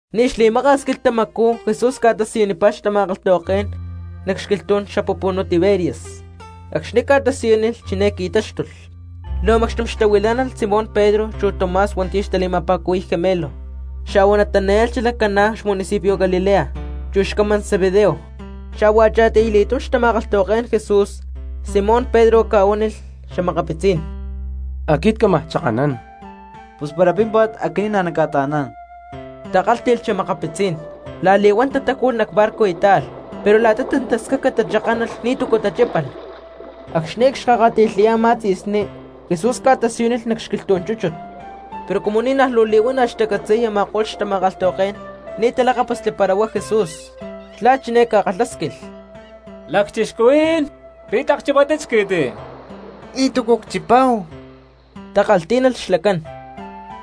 Ni̠ xli̠maka̠s quilhtamacú Jesús ca̠tasiyunipá xtama̠kalhtahuaké̠n nac xquilhtú̠n xapupunú Tiberias. Acxni̠ ca̠tasiyúnilh chiné qui̠táxtulh: Luu macxtum xtahuilá̠nalh Simón Pedro chu Tomás hua̠nti̠ xtali̠ma̠pa̠cuhui̠y Gemelo, xa̠hua Natanael xalac Caná xmunicipio Galilea, chu xcamán Zebedeo, xa̠hua a̠cha̠tiy li̠túm xtama̠kalhtahuaké̠n Jesús. Simón Pedro ca̠huánilh xa̠makapitzí̠n: —Aquit cámaj chakanán. —Pus para pímpa̠t aquinín nacca̠ta̠aná̠n —takálhti̠lh xa̠makapitzí̠n. La̠li̠huán tatáju̠lh nac barco y táalh. Pero la̠ta tantascaca tachakánalh ni̠túcu tachípalh. Acxni̠ aya cxkakati̠lhayá a̠má ca̠tzi̠sní, Jesús ca̠tasiyúnilh nac xquilhtú̠n chúchut, pero cumu ni̠ naj luu li̠huana̠ xtacatzi̠y a̠ma̠ko̠lh tama̠kalhtahuaké̠n ni̠ talakápasli para huá Jesús. Xlá chiné ca̠kalhásquilh: —Lacchixcuhuí̠n, ¿pi̠ tlak chipátit squi̠ti? —Ni̠túcu cchipáhu —takalhtí̠nalh xlacán.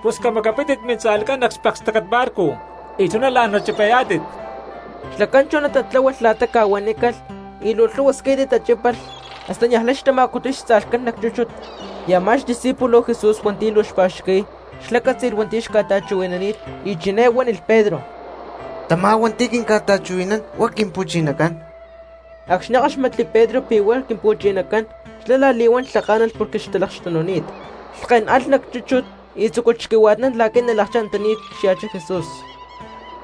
—Pus camacapítit mintza̠lhcán nac xpekstácat barco y chuná la̠n nachipayá̠tit. Xlacán chuná tatláhualh la̠ta ca̠huanícalh, y luu lhúhua squi̠ti tachípalh, hasta niaj lay xtama̠cutuy xtza̠lhcán nac chúchut. Y amá xdiscípulo Jesús hua̠nti̠ luu xpa̠xqui̠y xlá cátzi̠lh hua̠nti̠ xca̠ta̠chuhui̠nani̠t y chiné huánilh Pedro: —¡Tamá hua̠nti̠ quinca̠ta̠chuhui̠naná̠n huá Quimpu̠chinacán! Acxni̠ káxmatli Pedro pi̠ huá Quimpu̠chinacán, xlá la̠li̠huán lhaká̠nalh porque xtalakxtununi̠t, lhkén alh nac chúchut tzúculh xquihua̠tnán la̠qui̠ nalakchá̠n antaní xya̠chá Jesús.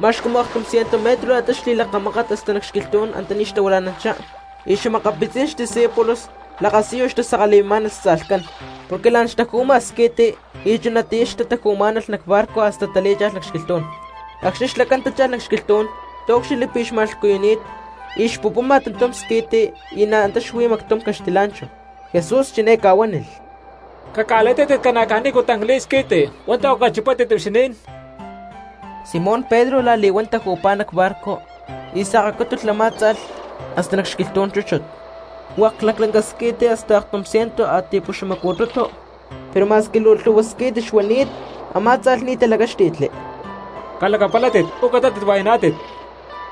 Ma̠x cumu aktum ciento metro la̠ta xli̠lakamákat hasta nac xquilhtú̠n antaní xtahuila̠nanchá, y xa̠makapitzí̠n discípulos lakasiyu xtasakali̠mimá̠nalh xtza̠lhcán porque la̠n xtaju̠ma squi̠ti y chunatiyá xtataju̠má̠nalh nac barco hasta talí̠cha̠lh nac xquilhtú̠n. Acxni̠ xlacán tácha̠lh nac xquilhtú̠n taúcxilhli pi̠ xma̠lhcuyuni̠t y cxpupuma tantum squi̠ti y na̠ antá xuí mactum caxtilá̠nchahu. Jesús chiné ca̠huánilh: —Caca̠li̠tátit ca̠na caj tancli̠t squi̠ti hua̠ntu̠ a̠cu chipátit huixinín. Simón Pedro la̠li̠huán taju̠pá nac barco y sakacútulh a̠má tza̠lh hasta nac xquilhtú̠n chúchut, hua̠k laclanca squi̠ti hasta aktum ciento a̠ti̠puxamacu̠tutu, pero ma̠squi luu lhu̠hua squi̠ti xuani̠t, a̠má tza̠lh ni̠ talacáxti̠tli. —¡Calacapalátit, uú catátit hua̠yaná̠tit!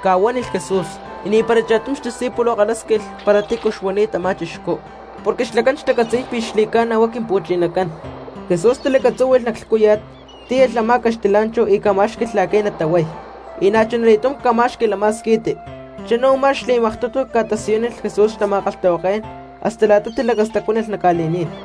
—ca̠huánilh Jesús. Y ni̠para cha̠tum xdiscípulo xkalhásquilh para tícu xuani̠t a̠má chixcú, porque xlacán xtacatzi̠y pi̠ xli̠ca̠na huá Quimpu̠chinacán. Jesús talacatzúhui̠lh nac lhcúya̠t, tíyalh a̠má caxtilá̠nchahu y ca̠má̠xqui̠lh la̠qui̠ natahuay, y na̠chuna li̠túm ca̠má̠xqui̠lh a̠má squi̠ti. Chuná u̠má xli̠maktutu ca̠tasiyúnilh Jesús xtama̠kalhtahuaké̠n hasta la̠ta tilacastacuánalh nac ca̠li̠ní̠n.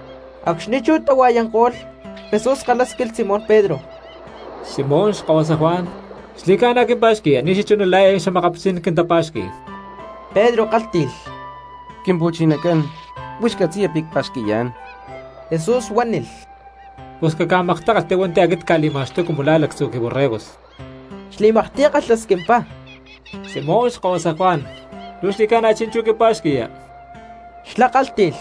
Acxni̠ chú tahua̠yanko̠lh, Jesús kalhásquilh Simón Pedro: —Simón xkahuasa Juan, ¿xli̠ca̠na quimpa̠xqui̠ya ni̠ xachuná la̠ eé xa̠makapitzí̠n quintapa̠xqui̠y? Pedro kálhti̠lh: —Quimpu̠chinacán, huix catzi̠ya pi̠ cpa̠xqui̠yá̠n. Jesús huánilh: —Pus caca̠maktákalhti hua̠nti̠ aquit cca̠li̠ma̠xtuy cumu la̠ lactzu̠ quiborregos. Xli̠maktiy kalhasquimpá: —Simón xkahuasa Juan, ¿luu xli̠ca̠na chi̠nchú quimpa̠xqui̠ya? Xlá kálhti̠lh: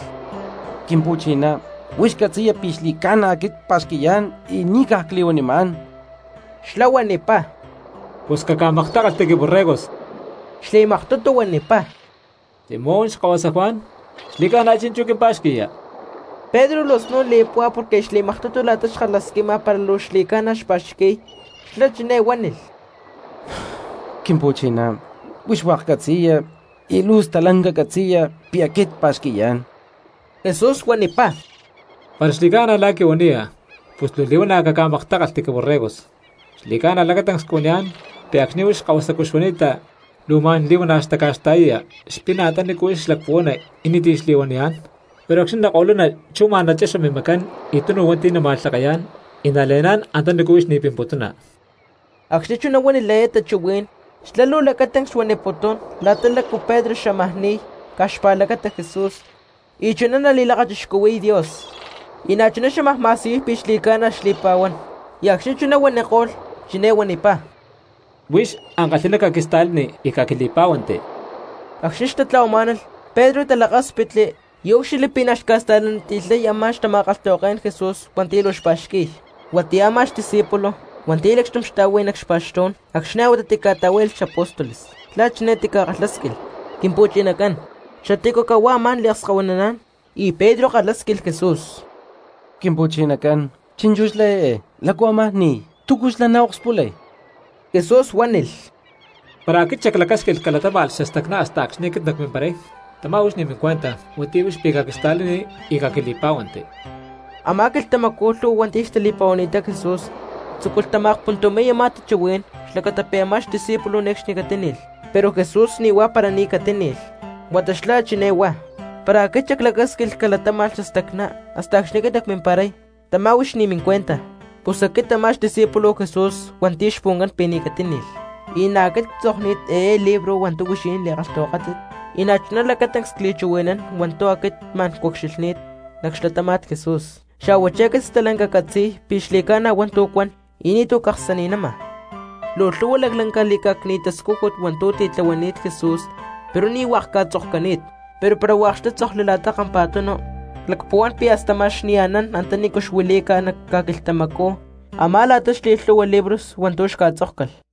—Quimpu̠chiná, huix catzi̠ya pi̠ xli̠ca̠na aquit cpa̠xqui̠yá̠n y ni̠ caj cli̠huanimá̠n. Xlá huanipá: —Pus caca̠maktákalhti quiborregos. Xli̠maktutu huanipá: —Simón xkahuasa Juan, ¿xli̠ca̠na chi̠nchú quimpa̠xqui̠ya? Pedro luu snún li̠púhua porque aya xli̠maktutu la̠ta xkalhasquima para luu xli̠ca̠na xpa̠xqui̠y, xlá chiné huánilh: —Quimpu̠chiná, huix hua̠k catzi̠ya y luu stalanca catzi̠ya pi̠ aquit cpa̠xqui̠yá̠n. Jesús huanipá: —Para xli̠ca̠na la̠ quihuaniya, pus luu li̠huana̠ caca̠maktákalhti quiborregos. Xli̠ca̠na lacatancs cuaniyá̠n, pi̠ acxni̠ huix kahuasacú xuani̠ta luu ma̠n li̠huana̠ xtaca̠xta̠yaya xpina antanícu huix xlacpuhuana y ni̠ti̠ xli̠huaniyá̠n, pero acxni̠ nako̠luna chú ma̠n nachexa mimacán y tunu hua̠nti̠ nama̠lhake̠yá̠n y nale̠ná̠n antanícu huix ni̠ pimputuna. Acxni̠ chuná huánilh eé tachuhuí̠n, xlá luu lacatancs xuaniputún la̠ta lácu Pedro xámaj ni̠y caj xpa̠lacata Jesús y chuná nali̠lakachixcuhui̠y Dios, y na̠chuná xámaj li̠ma̠siyuy pi̠ xli̠ca̠na xli̠pa̠huán. Y acxni̠ chuná huaniko̠lh chiné huanipá: —Huix ankalhi̠ná caquista̠lani y caquili̠pá̠huanti. Acxni̠ xtatla̠huamá̠nalh Pedro talakáspitli y úcxilhli pi̠ na̠ xca̠sta̠laniti̠lhay a̠má xtama̠kalhtahuaké̠n Jesús hua̠nti̠ luu xpa̠xqui̠y, huatiyá a̠má xdiscípulo hua̠nti̠ lacxtum xtá̠hui nac xpa̠xtú̠n acxni̠ a̠huatá tica̠ta̠huá̠yalh xapóstoles, xlá chiné tikalhásquilh: “Quimpu̠chinacán, ¿xatícu cahuá amá̠n liakskahuinaná̠n?” Y Pedro kalhásquilh Jesús: —Quimpu̠chinacán, chi̠nchú xlá eé ¿lácu ámaj ni̠y? ¿Túcu xlá naokspulay? Jesús huánilh: —Para aquit xaclacásquilh calatáma̠lh xastacná hasta acxni̠ aquit nacmimparay, tamá huix ni̠ mincuenta; huatiyá huix pi̠ caquista̠lani y caquili̠pá̠huanti. Amá quilhtamacú, lhu̠hua hua̠nti̠ xtali̠pa̠huani̠ttá Jesús tzúculh tama̠akpuntumi̠y a̠má tachuhuí̠n xlacata pi̠ a̠má xdiscípulo ne̠cxni catíni̠lh. Pero Jesús ni̠ huá para ni̠ catíni̠lh, huata xlá chiné huá: “Para aquit xaclacásquilh calatáma̠lh xastacná hasta acxni̠ aquit nacmimparay, tamá huix ni̠ mincuenta.” Pus aquit a̠má xdiscípulo Jesús hua̠nti̠ xpuhuancán pi̠ ni̠ catíni̠lh, y na̠ aquit ctzokni̠t eé libro hua̠ntu̠ huixinín li̠kalhtahuakátit, y chuná lacatancs cli̠chuhui̠nán hua̠ntu̠ aquit ma̠n cucxilhni̠t nac xlatáma̠t Jesús. Xa̠huachí aquit stalanca ccatzi̠y pi̠ xli̠ca̠na hua̠ntu̠ cuan y ni̠tu̠ caksani̠nama. Luu lhu̠hua laclanca li̠cá̠cni̠t tascújut hua̠ntu̠ titlahuani̠t Jesús pero ni̠ hua̠k ca̠tzokcani̠t, pero para hua̠k xtátzokli la̠ta kampa̠tunu, clacpuhuán pi̠ hasta ma̠x ni̠ anán antanícu xuilí̠ca nac ca̠quilhtamacú a̠má la̠ta xli̠lhu̠hua li̠bros hua̠ntu̠ xca̠tzókcalh.